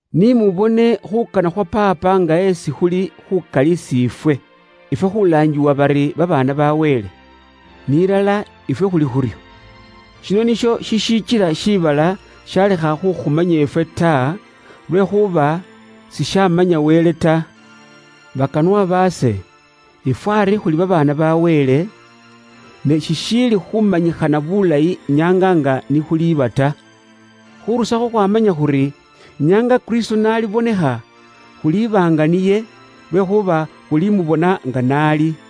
Ni mubone khuukana khwa Paapa nga esi khuli khuukali isi ifwe: ifwe khuulaangiwa bari babaana ba Wele. Ni ilala ifwe khuli khuryo. Shino nisho shishikila shiibala shalekha khukhumanya ifwe ta, lwekhuuba sishaamanya Wele ta. Bakanwa baase, ifwe ari khuli babaana ba Wele, ne shishiili khumanyikhana bulayi nyaanga nga ni khuliba ta. Khurusakho khwaamanya khuri nyaanga Kristo n'alibonekha, khuliba nga niye, lwekhuuba khulimubona nga n'ali.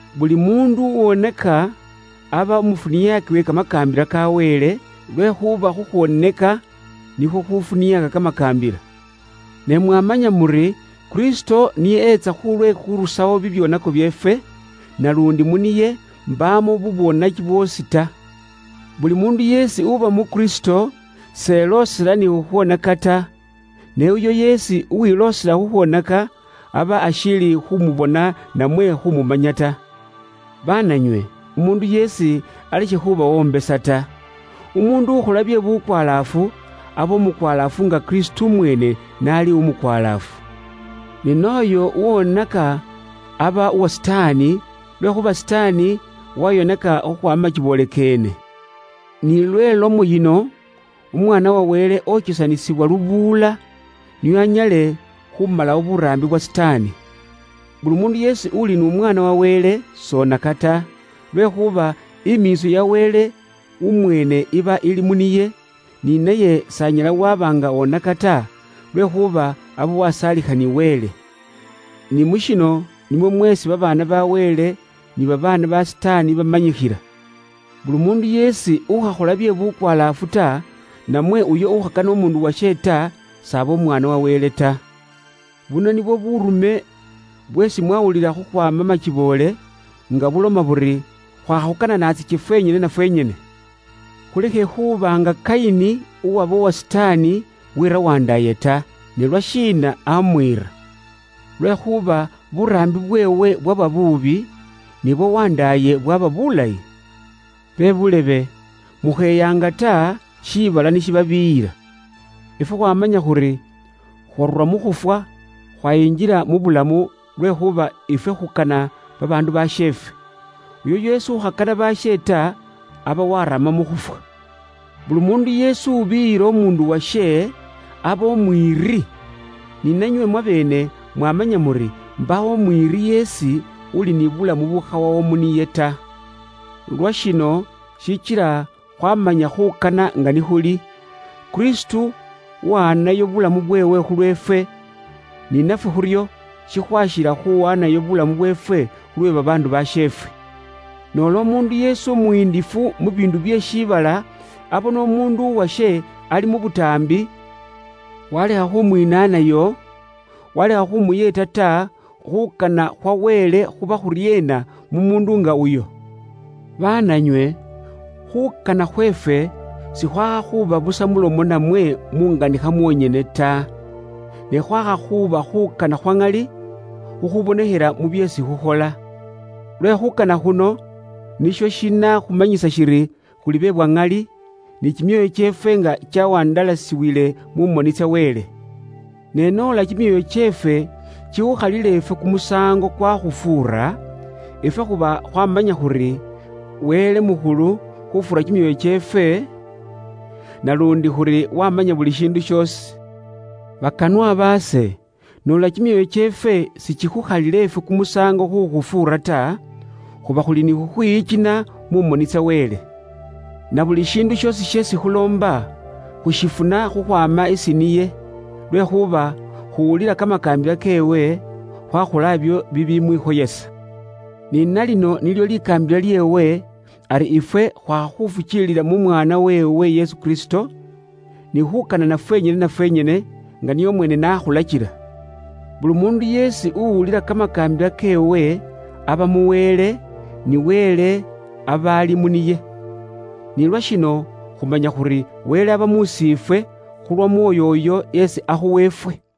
Buli muundu ukhola bye bubwoonaki, aba umufuniaaki we kamakaambila ka Wele, lwekhuuba khukhwooneka nikhwo khufuniaaka kamakaambila. Ne mwamanya muri, Kristo niye etsa khulwe khurusawo bibyoonako byeefwe, naluundi mu niye mbaamo bubwoonaki bwoosi ta. Buli muundu yeesi uba mu Kristo s'eloosela ni khukhwonaka ta. Ne uyo yeesi uwiloosela khukhwoneka, aba ashiili khumubona namwe khumumanya ta. Baananywe, umuundu yeesi alekhe khubawombesa ta. Umuundu ukhola bye bukwalaafu, aba umukwalaafu nga Kristo umweene n'ali umukwalaafu. Ni n'ooyo ukhola bye bubwoonaki aba uwa Sitaani, lwekhuuba Sitaani wayoneka khukhwaama makiboole keene. Ni lwe lomo yino, Umwaana wa Wele okesanisibwa lubuula, nio anyale khumalawo buraambi bwa Sitaani. Buli muundu yeesi uli umwaana uwa Wele s'akhola bye bubwoonaki ta, lwekhuuba imiitso ya Wele umweene iba ili mu niye, ni naye s'anyala waba nga oneka ta, lwekhuuba aba wasaalikha ni Wele. Ni mu shino nimwo mweesi babaana ba Wele ni babaana ba Sitaani bamanyikhila: buli muundu yeesi ukhakhola bye bukwalaafu ta, namwe uyo ukhakana umuundu washe ta, s'aba umwaana wa Wele ta. Buno nibwo buurume bweesi mwawulila khukhwaama makiboole, nga buloma buri: khwakha khukananatsake fwenyene na fwenyene. Khulekhe khuuba nga Kayini, uwaba uwa Sitaani, weera wandaaye ta. Ne lwashiina amwiira? Lwekhuuba buraambi bweewe bwaba buubi, ne bwa wandaaye bwaba bulayi. Bebuulebe, mukheyaanga ta, shiibala ni shibabiiyila. Ifwe khwaamanya khuri khwaarura mu khufwa, khwayingila mu bulamu, lwekhuuba ifwe khukana babaandu basheefwe. Uyo yeesi ukhakana baashe ta, aba warama mu khufwa. Buli muundu yeesi ubiiyila umuundu washe, aba umwiiri. Ni nanywe mwabeene mwamanya muri, mbaawo umwiiri yeesi, uli ni bulamu bukhawawo mu niye ta. Lwashino shikila khwaamanya khuukana nga ni khuli: Kristo aawaanayo bulamu bweewe khulweefwe, ni nafwe khuryo shikhwaakhila khuwaanayo bulamu bweefwe khulwe babaandu basheefwe. Noola umuundu yeesi umuyindifu mu biindu bye mu shibala muno abona umuundu washe ali mu butaambi walekha khumwinaanayo, walekha khumuyeeta ta, khuukana khwa Wele khuba khuryeena mu muundu nga uyo? Baananywe, khuukana khweefwe sikhwaakha khuuba busa mulomo namwe munganikha mwonyene ta, ne khwaakha khuuba khuukana khwa ŋali, khukhuubonekhela mu byeesi khukhola. Lwe khuukana khuno nisho shinakhumanyisa shiri khuli be bwa ŋali, ni kimyoyo kyeefwe nga kyawandalasiwile mu moni tsa Wele. Ne noola kimyoyo kyeefwe kikhukhalila ifwe kumusaango kwakhufuura, ifwe khuba khwaamanya khuri, Wele mukhulu khufuura kimyoyo kyeefwe, naluundi khuri wamanya buli shiindu shoosi. Bakanwa baase, noola kimyoyo kyeefwe sikikhukhalila ifwe kumusaango khukhufuura ta, khuba khuli ni khukhwiyikina mu moni tsa Wele. Na buli shiindu shoosi sheesi khuloomba, khushifuna khukhwaama isi niye, lwekhuuba khuwulila kamakaambila keewe, khwakhola ibyo bibimwikhoyesa. Ni nalino nilyo likaambila lyeewe, ari ifwe khwakha khufukiilila mu Mwaana weewe Yesu Kristo, ni khuukanana fwenyene na fwenyene nga niye umweene n'akhulakila. Buli muundu yeesi uwulila kamakaambila keewe aba mu Wele, ni Wele aba ali mu niye. Ni lwashino khumanya khuri Wele aba mus'iifwe, khulw'Omwoyo uyo esi akhuwa ifwe.